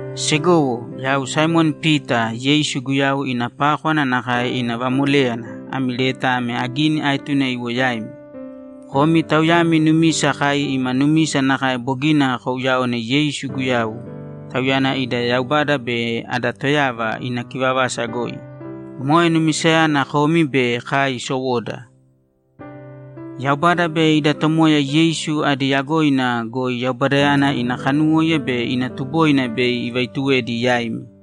Segowo, Yau Saimoni Pita, Yeisu Guyau ina pákwana nakae ina vamoléyana, ami leta ame agini aetune iwo yaimi. Komi tauyami numisa kai ima numisa nakae bogina kouyaone Yeisu Guyau, Tauyana ida Yaubada be ada Toyava, ina kivavasa goi. Moe numisayana komi be kai sowoda. Yaubada be ida Tomoya Yeisu adi yagoina goi Yaubadayana ina kanuwóiya be ina tuboina bei ivaituwedi yaimi.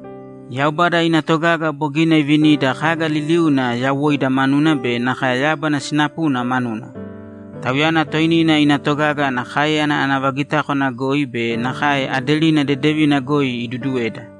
Yaubada ina togaga bogina ivinida kaga liliuna yawoida manuna be nakae yábana sinapuna manuna. Tauyana toinina ina togaga ana káeyana ana vagitákwana goi be nakae aderina dedevina goi iduduweda.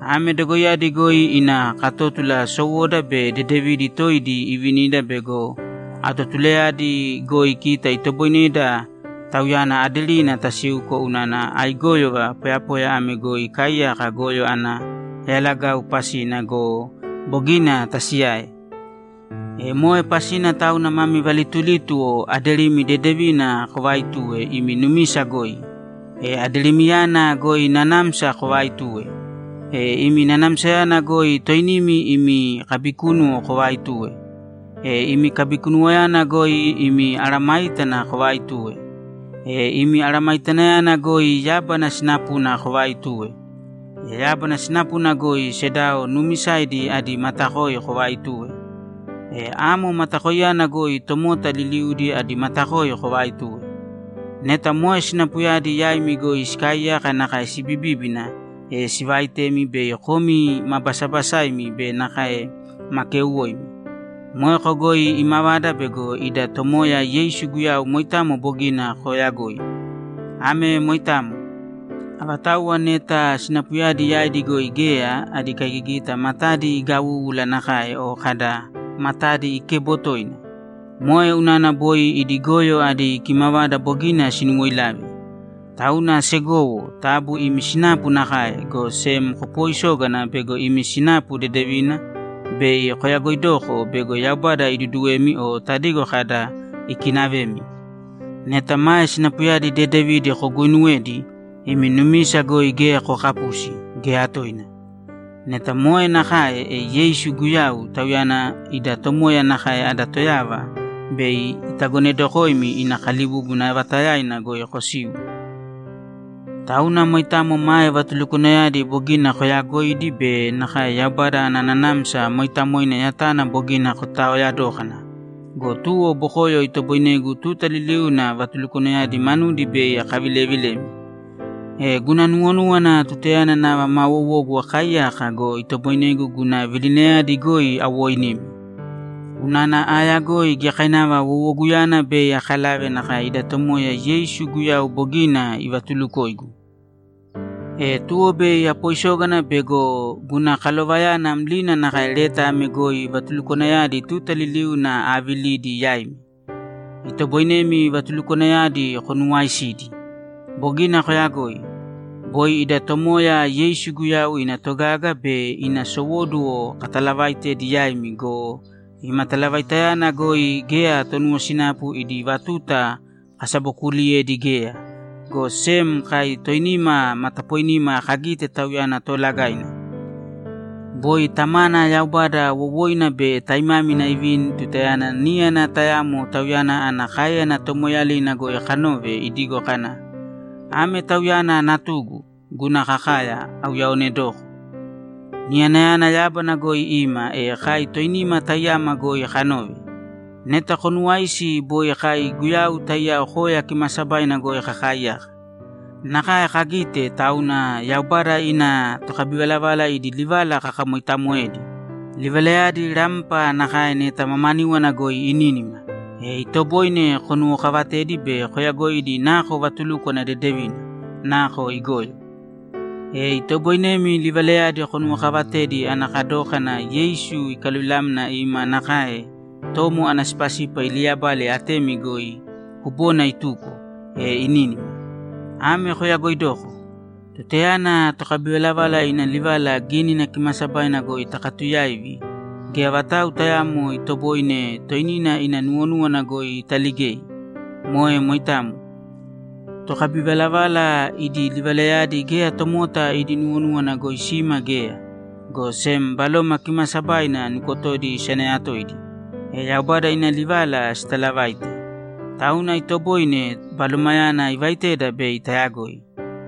Ame dogoiyadi goi ina katótula sowoda be dedevidi toidi ivinida bego atotulayadi goi kita itoboineda Tauyana aderina tasiuko unana aigóyova poyapoya ame goi ikaaiyaka goyo ana yalagau pasina go, bogina tasiyae. E moe pasina tauna mami valitulítuwo aderimi dedevina kovaaitūwe imi numisa goi. E aderimiyana goi nanamsa kovaaitūwe. E imi nanamsayana goi toinimi imi kabikúnuwo kovaaitūwe. E imi kabikunuwoyana goi imi mesayágana kovaaitūwe. E imi aramaitanayana goi yábana sinapuna kovaaitūwe. E yábana sinapuna goi sedao nuumisaidi adi matakoi kovaaitūwe. E amo matakoiyana goi tomota liliudi adi matakoi kovaaitūwe. Neta moe sinapuyadi yaimi goi sikaaiyaka nakae sibibíbina, e sivaitemi bei komi ma basabasaimi be nakae ma keuwoimi. Moeko goi imavada bego ida Tomoya Yeisu Guyau moitamo bogina kooyagoi. Ame moitamo. Avatauwa neta sinapuyadi yaidi goi geya, adi kaigigita matadi igawúwula nakae o kada, ‘Matadi ikebo toina.’ Moe unana boi idi goyo adi kimavada bogina sinuwoilave. Tauna segowo, taabu imi sinapu nakae, go sem kopooisōgana bego imi sinapu dedevina bei koyagoidoko bego Yaubada iduduwemi o tadigo kada, ‘Ikinavemi.’ Neta mae sinapuyadi dedevidi koguuinuwedi, imi numisa goi geya kookapusi, geya toina. Neta moe nakae, e Yeisu Guyau, Tauyana ida Tomoya nakae ada Toyava, bei itagonedokoimi ina kalibúbuna vaatayaina goi kosiu. Tauna moitamo mae vatulukwanayadi bogina koyaagoidi be nakae Yaubada ana Nanamsa Mooitamoina yatana bogina kotaaoya dókana go, tuwo bokoyo itoboinegu tuta liliuna vatulukwanayadi manudi bei akavilevilemi. E guna nuwonúwana tutayana nava maa wowogu akaaiyaka go, itoboinegu guna vilinayadi goi awoinimi. Unana aayagoi giyakainava wowoguyana bei akalave nakae ida Tomoya Yeisu Guyau bogina ivatulukoigu. E tuwo bei apoisógana bego guna kalovayana mlina nakae leta ame goi vatulukwanayadi tuta liliuna aavilidi yaimi. Itoboinemi vatulukwanayadi konuwaaisidi. Bogina koyagoi. Boi ida Tomoya Yeisu Guyau ina togaga be ina sowóduwo katalavaitedi yaimi go, ima talavaitayana goi geya tonuwosinapu idi vatuta kasabokuuliyedi geya, go sem kai toinima matapoinima kagite Tauyana Toolagaina. Boi Tamana Yaubada wowoina be taimámina ivini tutayana níyana tayamo Tauyana ana káeyana tomoeeyalina goi kanove idigo kana, ‘Ame Tauyana Natugu, guna kakaya, auyaaonedoko.’ Niyanayana yábana goi ima, e kai toinima taiyama goi kanove. Neta konuwaisi boi kai Guyau taiyao koya kimaasabaina goi kakaaiyaka. Nakae kagite, tauna Yaubada ina tokabivalavala idi livala kakamoitamoedi. Livalayadi rampa nakae neta mamaníwana goi inínima, e itoboine konuwokavatedi be koyagoidi nako vatulúkwana dedevina, nako igoyo. E itoboinemi livalayadi konuwokavatedi ana kadókana Yeisu ikaluvilamna ima nakae tomo ana sipasipa iliyabale atemi goi kubona ituko, e inínima. Ame koyagoidōko: Tutayana tokabivalavala ina livala Gínina Kimaasabaina goi takatuyaivi, geya vatau tayaamo itoboine toinina ina nuwonúwana goi italigei. Moe moitamo. Tokabivalavala idi livalayadi geya tomota idi nuwonúwana goi sima geya, go sem Baloma Kimaasabaina nukotodi isanayatoidi, e Yaubada ina livala sitalavaite. Tauna itoboine Balomayana ivaiteda bei tayagoi.